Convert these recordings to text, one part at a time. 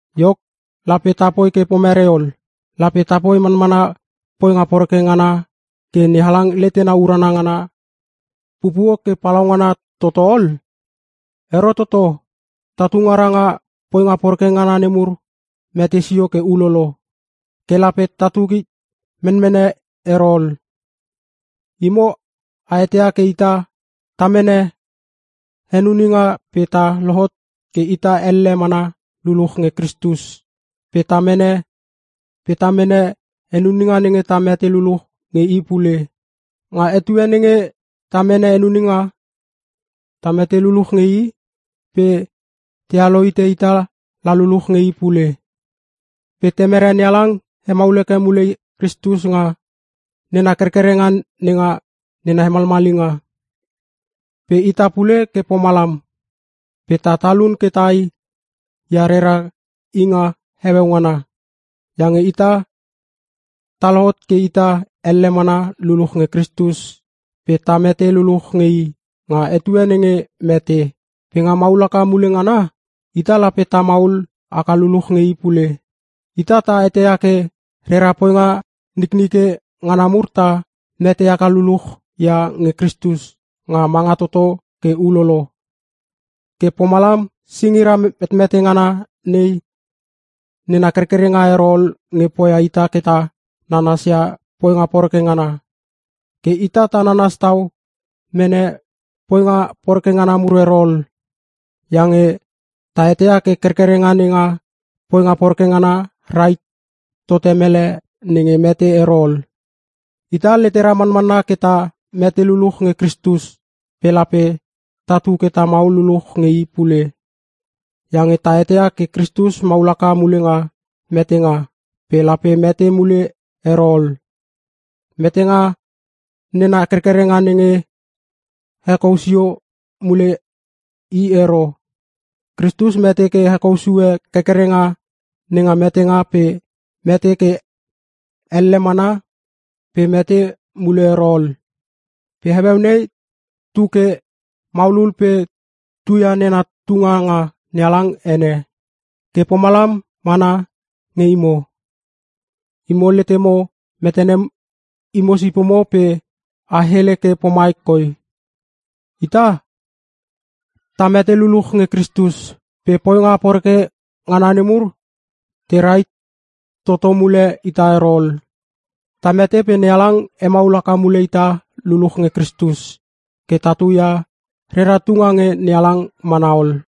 Iok, lape ta poi ke pomerei ol? Lape tapoi manmana poinga poreke ngana ke NeHalang letena urana ngana pupuo ke palaungana tototo ol? Ero toto! Tatu ngara nga poinga poreke ngana nemur mete sio ke ulolo. Ke lape tatu hit menmene ero ol! Imo a eteia ke ita ta mene henuninga pe ta lohot ke ita elle mana luluch nge Kristus, pe ta mene henuninga nenge ta mete luluch nge i pule. Nga etue nenge ta mene henuninga, ta mete luluch nge i pe tealo hite ita la luluch nge i pule. Pe Temere NeHalang hemaul heke mule Kristus nga nena kerkerenga nenga nena hemalmalinga. Pe ita pule ke pomalam, pe ta talun ke tai ia rera inga heueu ngana. Iange ita ta lohot ke ita elle mana luluch nge Kristus pe ta mete luluch nge i nga etue nenge mete. Pe nga maul haka mule ngana ita lape ta maul haka luluch nge i pule. Ita ta eteia ke rera poinga niknike ngana mur ta mete haka luluch ia nge Kristus nga manga toto ke ulolo. Ke pomalam singira metmete ngana nei nena kerkerenga ero ol nge poia ita ke ta nanas ia poinga poreke ngana. Ke ita ta nanas tau mene poinga poreke ngana mur ero ol. Iange ta eteia ke kerkerenga nenga poinga poreke ngana rahit tote mele nenge mete ero ol. Ita letera manmanna ke ta mete luluch nge Kristus pe lape tatu ke ta maul luluch nge i pule. Iange ta eteia ke Kristus maul haka mule nga metenga pe lape mete mule ero ol; metenga nena kerkerenga nenge hekou sio mule i ero. Kristus mete ke hekou sue kerkerenga nenga metenga pe mete ke elle mana pe mete mule ero ol. Pe heueu nei tu ke maulul pe tuia nena tunga nga NeHalang ene. Ke pomalam mana nge imo. Imo letemo metene imo sipomo pe a hele ke pomai koi: Ita ta mete luluch nge Kristus pe poinga poreke ngana nemur te rahit toto mule ita ero ol. Ta mete pe NeHalang hemaul haka mule ita luluch nge Kristus ke tatu ia rera tunga nge NeHalang mana ol.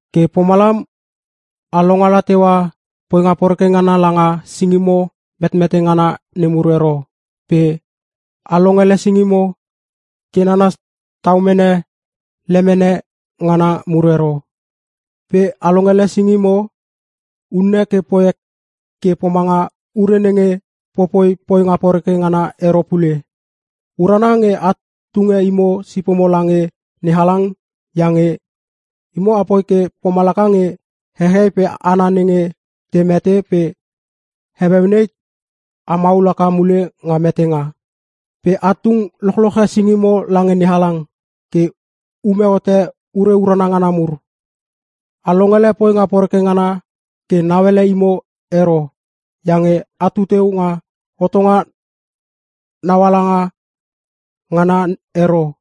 Ke pomalam a longala teua poinga poreke ngana langa singimo metmete ngana nemur ero pe a longele singimo ke nanas tau mene lemene ngana mur ero. Pe a longele singimo unne ke poi ke pomanga ure nenge popoi poinga poreke ngana ero pule. Urana nge a tunge imo sipomo lange NeHalang iange imo apoi ke pomalaka nge hehei pe hana nenge te mete pe heueu nei a maul haka mule nga metenga. Pe a tung lochloche singimo lange NeHalang ke ume hote ure urana ngana mur. A longele poinga poreke ngana ke nauele imo ero iange atu teu nga hotonga nauala ngana ero,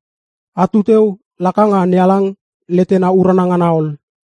atu teu laka nga NeHalang letena urana ngana ol.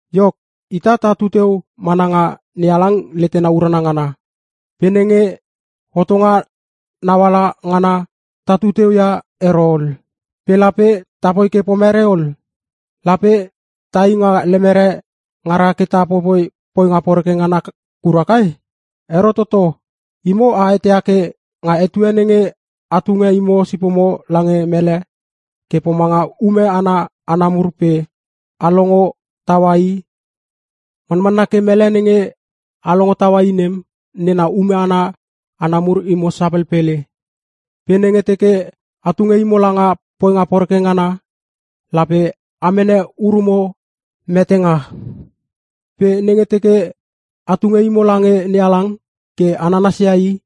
Iok, ita tatu teu mana nga NeHalang letena urana ngana. Pe nenge hotonga nauala ngana, tatu teu ia ero ol. Pe lape tapoi ke pomerei ol? Lape tai nga lemere ngara ke ta popoi poinga poreke ngana kura kai? Ero toto! Imo a eteia ke nga etue nenge a tunge imo sipomo lange mele ke pomanga ume ana hana mur pe a longo taua i, manmanna ke mele nenge a longo taua i nem nena ume ana hana mur imo sapelpele. Pe nenge teke a tunge imo langa poinga poreke ngana lape a mene urumo metenga. Pe nenge teke a tunge imo lange NeHalang ke a nanasia I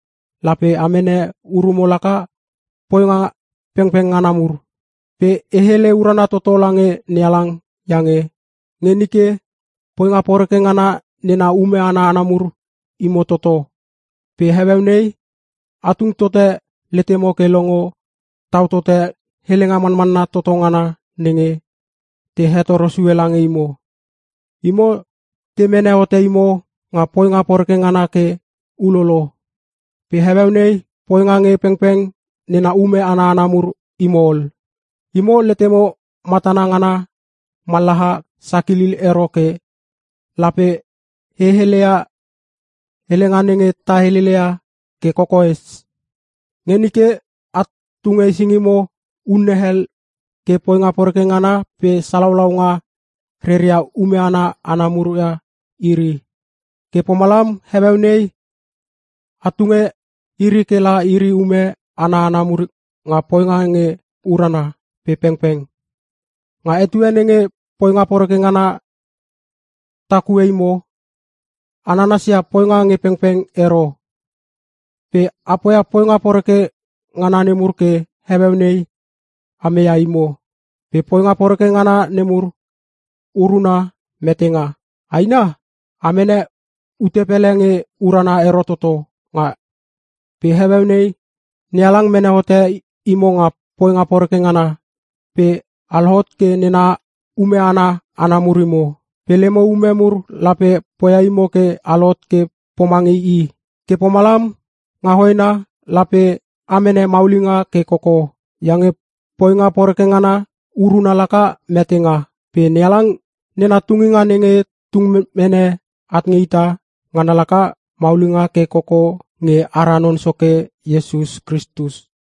lape a mene urumo laka poinga pengpeng ngana mur. Pe e hele urana toto lange NeHalang iange nge nike poinga poreke ngana nena ume ana hana mur imo toto, pe heueu nei a tung tote letemo ke longo tau tote helenga manmanna toto ngana nenge te hetoro sue lange imo. Imo te mene hote imo nga poinga poreke ngana ke ulolo pe heueu nei poinga nge pengpeng nena ume ana hana mur imo ol. Imo letemo matana ngana mallaha sakilil ero ke lape e heleia helenga nenge ta helele ia ke kokoes. Nge nike a tunge singimo unne hel ke poinga poreke ngana pe salaulaunga reria ume ana hana mur ia iri. Ke pomalam heueu nei a tunge iri ke la iri ume ana hana mur nga poinga nge urana pe pengpeng. Nga etue nenge poinga poreke ngana takue imo, a nanasia poinga nge pengpeng ero. Pe a poia poinga poreke ngana nemur ke heueu nei a meia imo. Pe poinga poreke ngana nemur uruna metenga. Aina! Amene ute pele nge urana ero toto nga etue nem! Pe heueu nei NeHalang mene hote imo nga poinga poreke ngana pe a lohot ke nena ume ana hana mur imo. Pe lemo ume mur lape poia imo ke a lohot ke pomange i. Ke pomalam, nga hoena lape a mene maulinga ke koko. Iange poinga poreke ngana uruna laka metenga, pe NeHalang nena tunginga nenge tung mene at nge ita, ngana laka maulinga ke koko nge ara Non Soke Iesus Kristus.